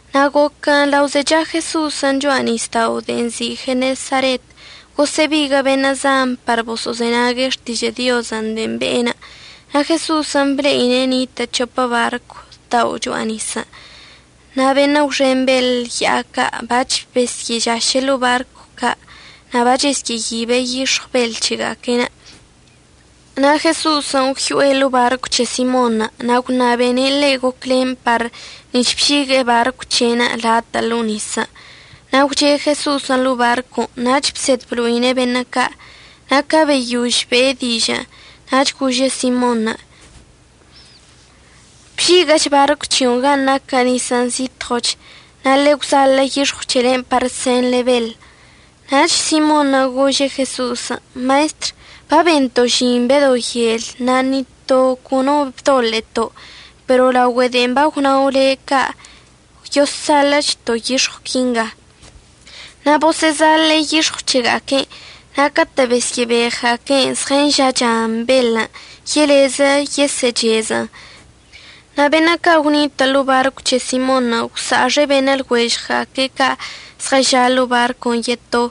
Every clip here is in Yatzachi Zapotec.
Na' goquən' lao zecha Jeso'osən' cho'a nisdaon' de'en nzi' Genesaret, gosə'əbiguə' beṉə' zan par boso'ozenague' xtižə' Diozən' de'en be'enə'. Na' Jeso'osən' ble'ine' nitə' c̱hopə barcw dao' cho'a nisən'. Na' beṉə' gwxen beḻ ya'a ca' bac̱h besə'əžaše' ḻo'o barcw ca' na' bachesyə'əyibe' yix̱ɉw beḻ c̱hega'aque'enə'. Na' Jeso'osən' gwyo'e ḻo'o barcw c̱he Simonṉə' na' gwṉabene' ḻe' gocwlen par nic̱h bžigue'e barcw c̱he'enə' latə' ḻo'o nisən'. Na' gwche' Jeso'osən' ḻo'o barcon' nach bsed blo'ine' beṉə' ca'. Na' ca beyož be'e dižə'ənə' nach gože' Simonṉə': ―Bžiguə'əch barcw c̱hio'onə' gan' naquə nisən' zitɉoch, na' ḻe'e əgwzaḻə' yix̱ɉw c̱helen' par senḻe beḻən'. Nach Simonṉə' gože' Jeso'osən': ―Maestr, babento' žin bedo yel na' ni to cono no bdoḻe'eto'. Pero laogüe de'e bagwnao' le' ca', yoszaḻə'əchto' yix̱ɉw quinga. Na' bosə'əzaḻe'e yix̱ɉw c̱hega'aque'enə', na' catə' besyə'əbeɉga'aque'en zɉənža'achan beḻən' yelezə yesə'əchezə'ən. Na' beṉə' ca' gwnitə' ḻo'o barcw c̱he Simonṉə' gwsa'axe' beṉə' lɉuežɉga'aque' ca' zɉəža' ḻo'o barcon' yeto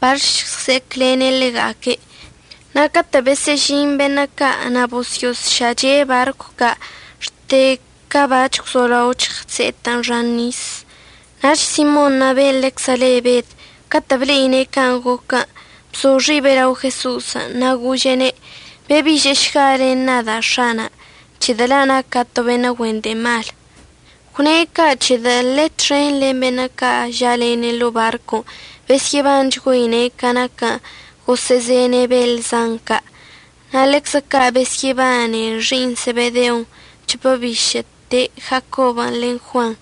par əžɉse'eclene' ḻega'aque'. Na' catə' besə'əžin beṉə' ca' na' bosyo'osša'ache' barcw ca' xte ca bac̱h gwzolao chse'etɉən xan nisən'. Nach Simonṉə' ben' ḻeczə le Bed catə' ble'ine' can' goquən', bzo xibe' lao Jeso'osən' na' gože'ene': ―Bebi'ižə'əšga len nada' X̱ana', c̱hedə' la' naca' to beṉə' güen de'e mal. Gwne' ca' c̱hedə' ḻe' txen len beṉə' ca' ža'alene' ḻo'o barcon' besyə'əbanchgüeine' ca naquən' gosə'əzene' beḻ zan ca'. Na' ḻeczə ca' besyə'əbane xi'iṉ Sebedeon' c̱hopə bišə'əte Jacobən' len Juanṉə',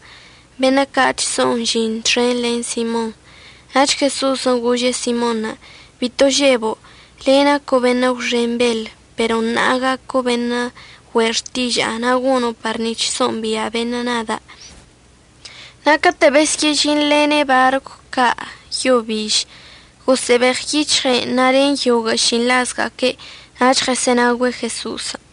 beṉə' ca' chso'on žin txen len Simonṉə'. Nach Jeso'osən' gože' Simonṉə': ―Bito žebo'. Le' naco' beṉə' gwxen beḻ. Pero ṉa'a gaco' beṉə' güe' xtiža'a, na' gono' par nic̱h so'ombia' beṉə' nada'. Na' catə' besyə'əžinḻene' barcw ca' yo biž, gosə'əbeɉyic̱hɉe'en na' len yoguə' šinḻazga'aque' nach ɉəsə'ənaogüe' Jeso'osən'.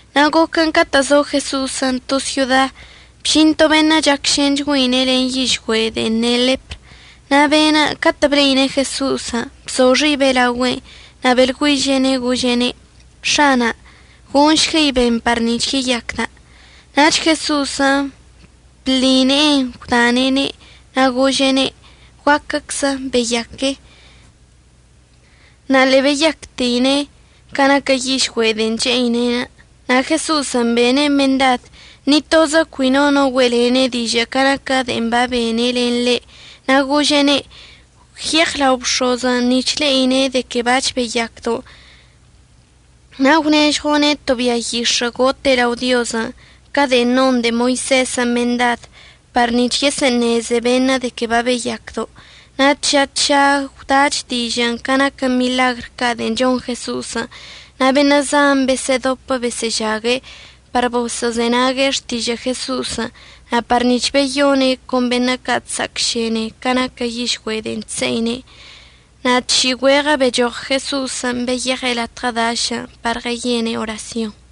Na' goquən catə' zo Jeso'osən' to syoda, bžin to beṉə' chacšenchgüeine' len yižgüe' de'en ne' ḻepr. Na' be'enə' catə' ble'ine' Jeso'osən' bzo xibe' laogüe'enə', na' beḻgüiže'ene' gože'ene': ―X̱ana', gonšguei ben par nic̱h yeyacda'. Nach Jeso'osən' bḻi ne'enə' gwdane'ene' na' gože'ene': ―Guacczə beyaque. Na' ḻe'e beyacteine' ca naquə yižgüe' de'en che'ine'enə'. Na' Jeso'osən' bene' mendad ni tozə cui no no güe'elene' dižə' ca naquə de'en babene' len le', na' gože'ene': ―Gwyeɉ lao bx̱ozən' nic̱h le'ine' de que bac̱h beyacdo'. Na' gwnežɉo'one' to bia yix̱ə' gote' lao Diozən' ca de'en non de'e Moisezən' mendad par nic̱h yesə'əṉeze beṉə' de que babeyacdo'onə'. Na' tža tža gwdach dižə' ca naquə miḻagr ca' de'en chon Jeso'osən'. Na' beṉə' zan besə'ədopə besə'əžague' par boso'ozenague' xtižə' Jeso'osən' na' par nic̱h beyone' con beṉə' ca' chsa'acšene ca naquə yižgüe' de'en chse'ine'. Na' tši'i güeɉə bechoɉ Jeso'osən' beyeɉe' latɉə dašən' par ɉəyene' orasyonṉə'.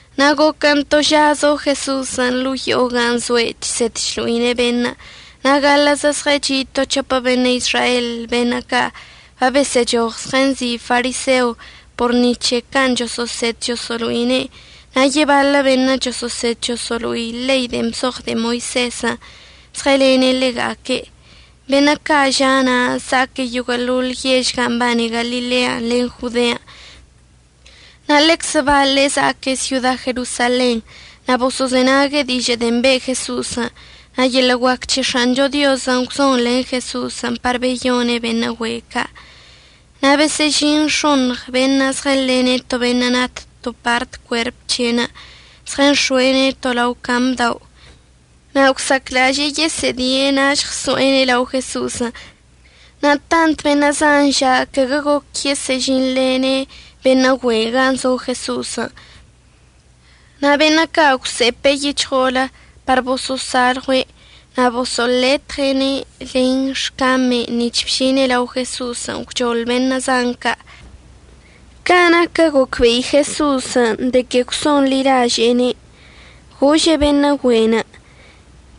Na' goquən' to ža zo Jeso'osən' ḻo'o yo'o gan' zoe'enə' chsed chlo'ine' beṉə'. Na' gaḻə'əzə zɉəchi' to c̱hopə beṉə' Izrael beṉə' ca' babesə'əchoɉ zɉənzi' fariseo por ni c̱he can' choso'osed choso'olo'ine'. Na' yebaḻə beṉə' choso'osed choso'olo'i ḻei de'en bzoɉ de'e Moisezən' zɉəlene' ḻega'aque'. Beṉə' ca' ža' na' za'aque' yoguə'əḻoḻ yež gan' mbane Galilean' len Jodean', na' ḻeczə baḻe' za'aque' syoda Jerosalenṉə'. Na' boso'ozenague' dižə' de'en be' Jeso'osən'. Na' yeḻə' guac c̱he X̱ancho Diozən' gwzon len Jeso'osən' par beyone' beṉə' güe' ca'. Na' besə'əžin x̱oṉɉ beṉə' zɉənḻene' to beṉə' nat to part cuerp c̱he'enə', zɉənx̱oe'ene' to lao cam dao'. Na' gwsa'aclaže'e yesə'ədie' na' əžɉso'ene' lao Jeso'osən'. Na' tant beṉə' zan ža' caguə goquə yesə'əžinḻene' beṉə' güe'enə' gan' zo Jeso'osən'. Na' beṉə' ca' gwse'epe' yic̱hɉo'olə par boso'osalɉue' na' boso'oletɉe'ene' len xcame'enə' nic̱h bžine' lao Jeso'osən' gwchoḻ beṉə' zan ca'. Ca naquə gocbe'i Jeso'osən' de que gwso'onḻilaže'ene', gože' beṉə' güe'enə':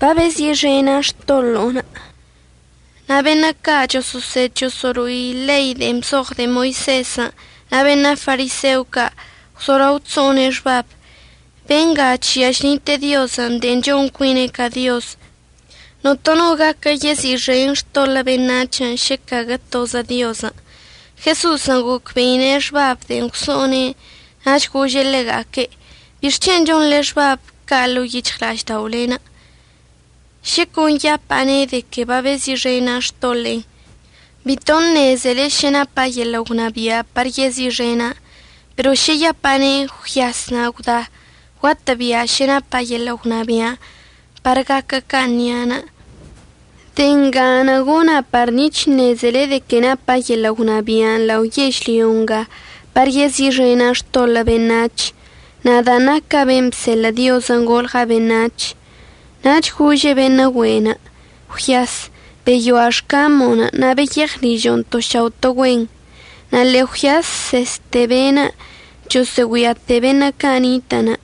―Babezi'ixena' xtoḻo'onə'. Na' beṉə' ca' choso'osed choso'olo'i ḻei de'en bzoɉ de'e Moisezən' na' beṉə' fariseo ca' gwzolao chso'one' xbab: “Benga chžia chnite'e Diozən' de'en chon cuine' ca Dioz. Notono no gaquə yezi'ixen xtoḻə' beṉac̱hən' šə caguə tozə Diozən'.” Jeso'osən' gocbe'ine' xbabən' de'en gwso'one'enə' nach gože' ḻega'aque': ―¿Bixc̱hen' chonḻe xbabən' ca' ḻo'o yic̱hɉla'ažda'olenə'? Šə con yapa'ane' de que babezi'ixena' xtoḻe'enə', bito ṉezele šə napa' yeḻə' gwnabia' par yezi'ixena'an. Pero šə yapa'ane': “Gwyas na' gwda”, guatə'əbia' šə napa' yeḻə' gwnabia'anə' par gaquə can' nia'anə'. De'e nga gona' par nic̱h əṉezele de que napa' yeḻə' gwnabia' lao yežlyo nga par yezi'ixena' xtoḻə' beṉac̱hən', nadan' naca' ben' bseḻə' Diozən' golɉa' beṉac̱h. Nach gože' beṉə' güe'enə': ―Gwyas, beyoa' xcamo'onə' na' beyeɉ ližo'onə' to šao' to güen. Na' ḻe'e gwyasseste be'enə', chosə'əgüiate' beṉə' ca' nitə'ənə'.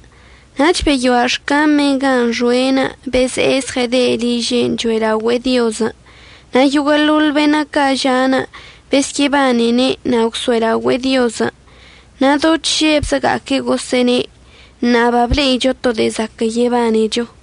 Nach beyoa' xcame'enə' gan' xoe'enə' beze'e zɉəyede' liže' cho'elaogüe'e Diozən'. Na' yoguə'əḻoḻ beṉə' ca' ža'anə' besyə'əbanene' na' gwso'elaogüe'e Diozən'. Na' do chžebga'aque' gosə'əne': ―Ṉa'a bable'icho to de'e zaquə' yebanecho.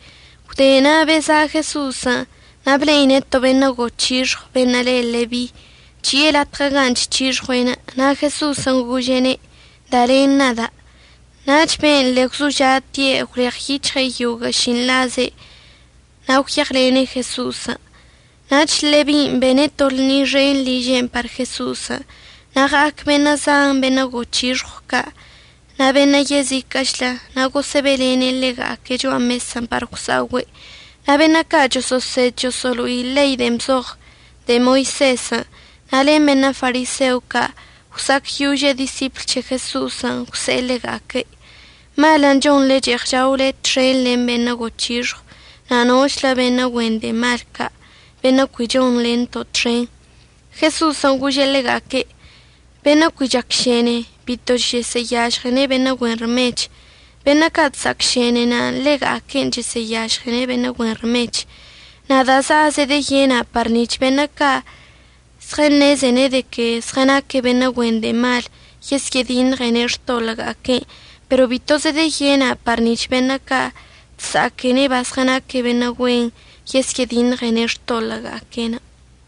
Gwde na' beza' Jeso'osən' na' ble'ine' to beṉə' goc̱hixɉw beṉə' le Lebi, chi'e latɉə gan' chc̱hixɉue'enə'. Na' Jeso'osən' gože'ene': ―Da len nada'. Nach be'enə' ḻe'e gwzoža'ate' gwleɉyic̱hɉe' yoguə' šinḻaze' na' gwyeɉlene' Jeso'osən'. Nach Lebin' bene' to lṉi xen liže'enə' par Jeso'osən'. Na' ɉa'ac beṉə' zan beṉə' goc̱hixɉw ca' na' beṉə' yeziquə'əchlə na' gosə'əbe'elene' ḻega'aque' cho'a mesən' par gwsa'ogüe'. Na' beṉə' ca' choso'osed choso'olo'i ḻei de'en bzoɉ de'e Moisezən' na' len beṉə' fariseo ca' gwsa'acyože' disipl c̱he Jeso'osən', gwse'e ḻega'aque': ―Malən' chonḻe che'eɉ chaole txen len beṉə' goc̱hixɉw na' nochlə beṉə' güen de'e mal ca' beṉə' cui chonḻento' txen. Jeso'osən' gože' ḻega'aque': ―Benə' cui chsa'acšene bito chəsə'əyažɉene' beṉə' güen rmech. Beṉə' ca' chsa'acšene ḻega'aque'enə' chəsə'əyažɉene' beṉə' güen rmech. Nada' za'a zedəyena' par nic̱h beṉə' ca' zɉəṉeze de que zɉənaque' beṉə' güen de'e mal yesyə'ədiṉɉene' xtoḻə'əga'aque'enə', pero bito zedeyena' par nic̱h beṉə' ca' chsa'aquene' bazɉənaque' beṉə' güen yesyə'ədiṉɉene' xtoḻə'əga'aque'enə'.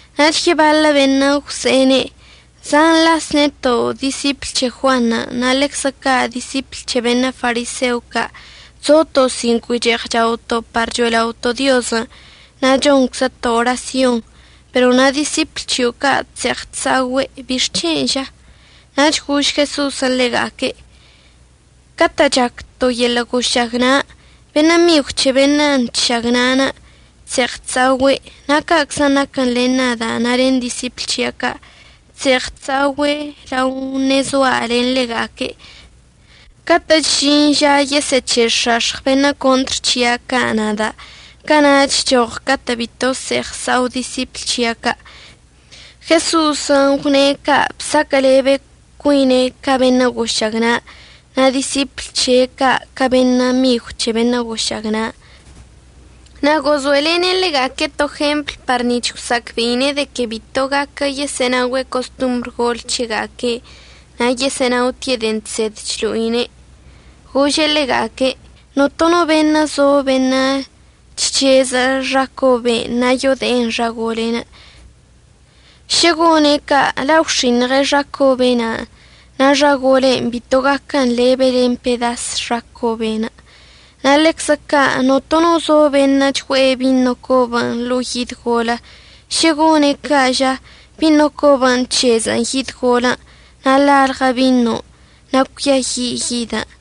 Nach yebaḻə beṉə' gwse'ene': ―Zan las neto' disipl c̱he Juanṉə' na' ḻeczə ca' disipl c̱he beṉə' fariseo ca' chzoto' sin cui che'eɉ chaoto' par cho'ela'oto' Diozən' na' chonczəto' orasyon. Pero na' disipl c̱hio' ca' chse'eɉ chsa'ogüe'. ¿Bixc̱hen' ža? Nach gož Jeso'osən' ḻega'aque': ―Catə' chac to yeḻə' gošagna' beṉə' migw c̱he be'enə' chšagna'anə' chse'eɉ chsa'ogüe'. Na' ca'aczən' naquən len nada' na' len disipl c̱hia' ca', chse'eɉ chsa'ogüe' lao ṉe'e zoa' len ḻega'aque'. Catə'əchən' əžin ža yesə'əc̱he'ex̱ax̱ɉ beṉə' contr c̱hia' ca' nada', cana'achən' əchoɉ catə' bito əse'eɉ əsa'o disipl c̱hia' ca'. Jeso'osən' gwne' ca' bsaquə'əlebe cuine' ca beṉə' gošagna', na' disipl c̱he' ca' ca beṉə' migw c̱he beṉə' gošagna'anə'. Na' gozo'elene' ḻega'aque' to jempl par nic̱h gwsa'acbe'ine' de que bito gaquə yesə'ənaogüe' costombr gol c̱hega'aque' na' yesə'ənaotie' de'en chsed chlo'ine'. Gože' ḻega'aque': ―Notono beṉə' zo beṉə' chc̱heze'e xa cobe'en na' yode'en xa gole'enə'. Šə gone' ca' la' gwx̱iṉɉe' xa cobe' na'anə' na' xa gole'en bito gaquən lebe len pedas xa cobe'enə'. Na' ḻeczə ca' notono zo beṉə' chgue'e bino cobən' ḻo'o yid golə. Šə gone' ca' ža, bino cobən' əc̱hezə'ən yid golən' na' lalɉə binon' na' cuiayi' yidən'.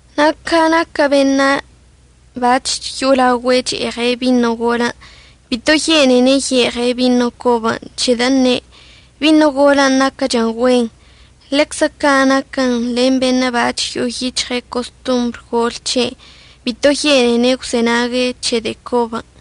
Na' ca naquə beṉə' bac̱h yo'olaogüe' che'eɉe' bino golən' bito yene'ene' ye'eɉe' bino cobən', c̱hedə' əṉe': “Bino golən' naquəchən güen.” Ḻeczə can' naquən len beṉə' bac̱h yo'o yic̱hɉe' costombr gol c̱he'enə', bito yene'ene' gwzenague' c̱he de'e cobən'.